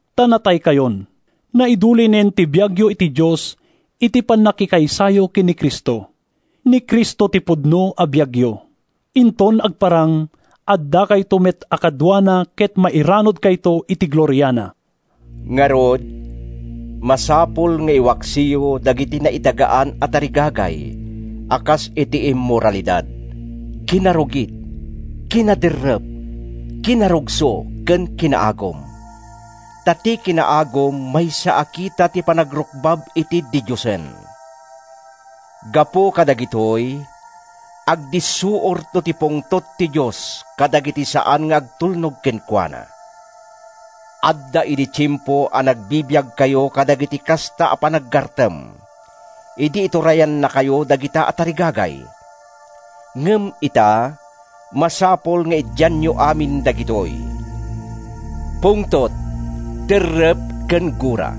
Ta nataykayon. Naidulinen ti biagyo iti Dios iti pannakikaysayo ken ni Cristo. Ni Cristo ti pudno a biagyo. Inton agparang, addakayto met a kaduana ket mairanudkayto iti gloriana! Ngarud, masapul nga iwaksiyo dagiti naidagaan a tarigagay a kas iti immoralidad, kinarugit, kinaderrep, kinarugso ken kinaagum (ta ti kinaagum maysa a kita ti panagrukbab iti didiosen). Gapu kadagitoy, agdissuorto ti pungtot ti Dios kadagiti saan nga agtulnog kenkuana. Adda idi tiempo a nagbibiagkayo kadagiti kasta a panaggartem, idi iturayannakayo dagita a tarigagay. Ngem ita, masapul nga idianyo amin dagitoy: pungtot, derrep ken gura.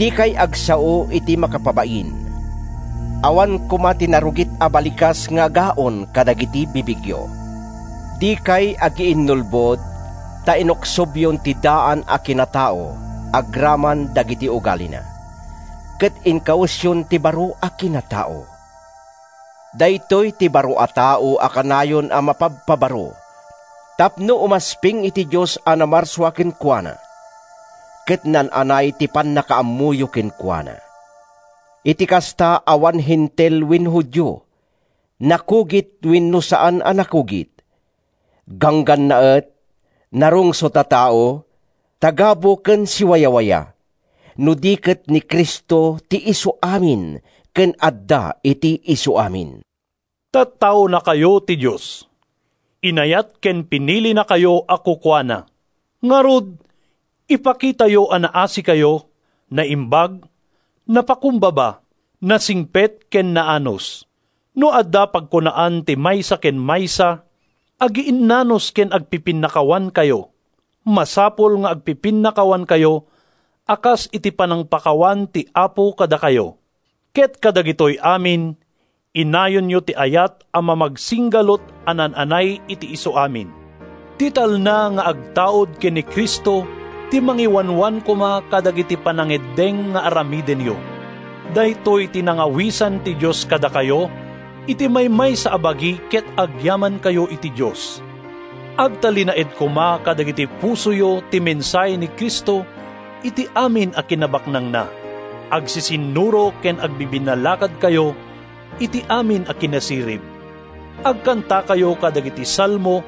Dikay agsao iti makapabain. Awan koma ti narugit a balikas nga agaon kadagiti bibigyo. Dikay agiinnulbod, ta inuksobyon ti daan a kinatao agraman dagiti ugalina, ket inkawesyon ti baro a kinatao. Daytoy ti baro a tao a kanayon a mapabpabaro tapno umasping iti Dios a namarsua kenkuana, ket naan-anay ti pannakaammoyo kenkuana. Iti kasta, awan Hentil wenno Judio, nakugit wenno saan a nakugit, ganggannaet, narungsot a tao, tagabu ken siwawayawaya, no di ket ni Cristo ti isuamin ken adda iti isuamin. Tattaonakayo ti Dios. Inayat ken pinilinakayo a kukuana. Ngarud, ipakitayo a naasikayo, naimbag, napakumbaba, nasingpet ken naanus. No adda pagkunaan ti maysa ken maysa, agiinnanus ken agpipinnakawankayo. Masapul nga agpipinnakawankayo a kas iti panangpakawan ti Apo kadakayo. Ket kadagitoy amin, inayonyo ti ayat a mamagsinggalut a naan-anay iti isuamin. Ti talna nga agtaud ken ni Cristo ti mangiwanwan koma kadagiti panangeddeng nga aramidenyo. Daytoy ti nangawisan ti Dios kadakayo iti maymaysa a bagi ket agyamankayo iti Dios. Agtalinaed koma kadagiti pusoyo ti mensahe ni Cristo iti amin a kinabaknangna. Agsisinnuro ken agbibinnalakadkayo iti amin a kinasirib. Agkantakayo kadagiti salmo,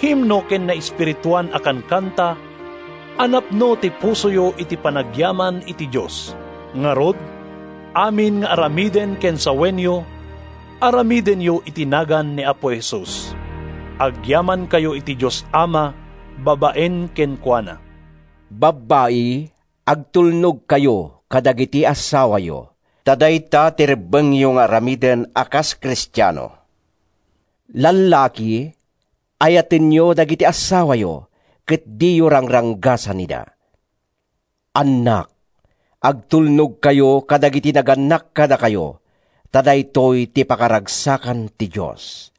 himno ken naespirituan a kankanta, a napno ti pusoyo iti panagyaman iti Dios. Ngarud, amin nga aramiden ken sawenyo, aramidenyo iti nagan ni Apo Jesus. Agyamankayo iti Dios Ama babaen kenkuana. Babbai, agtulnogkayo kadagiti assawayo, ta dayta ti rebbengyo nga aramiden a kas Kristiano. Lallaki, ayatenyo dagiti assawayo, ket diyo rangranggasan ida. Annak, agtulnogkayo kadagiti nagannak kadakayo, ta daytoy ti pakaragsakan ti Dios.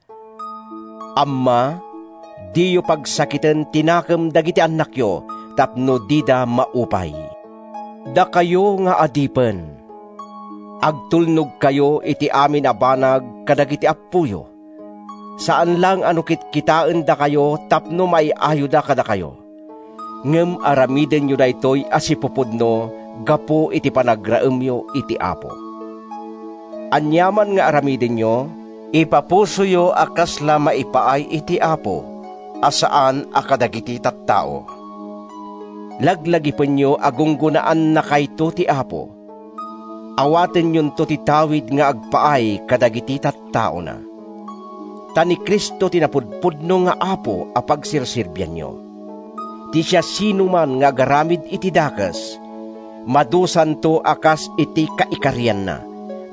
Amma, diyo pagsakiten ti nakem dagiti annakyo tapno dida maupay. Dakayo nga adipen, agtulnogkayo iti amin a banag kadagiti appoyo, saan laeng a no kitkitaendakayo tapno maay-ayoda kadakayo, ngem aramidenyo daytoy a sipupudno gapu iti panagraemyo iti Apo. Aniaman nga aramidenyo, ipapusoyo a kasla maipaay iti Apo, a saan a kadagiti tattao. Laglagipenyo a gunggonaannakayto ti Apo. Awatenyonto ti tawid nga agpaay kadagiti tattaona. Ta ni Cristo ti napudpudno nga Apo a pagserserbianyo. Ti siasinoman nga agaramid iti dakes, madusanto a kas iti kaikarianna,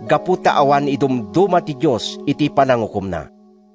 gapu ta awan idumduma ti Dios iti panangukomna.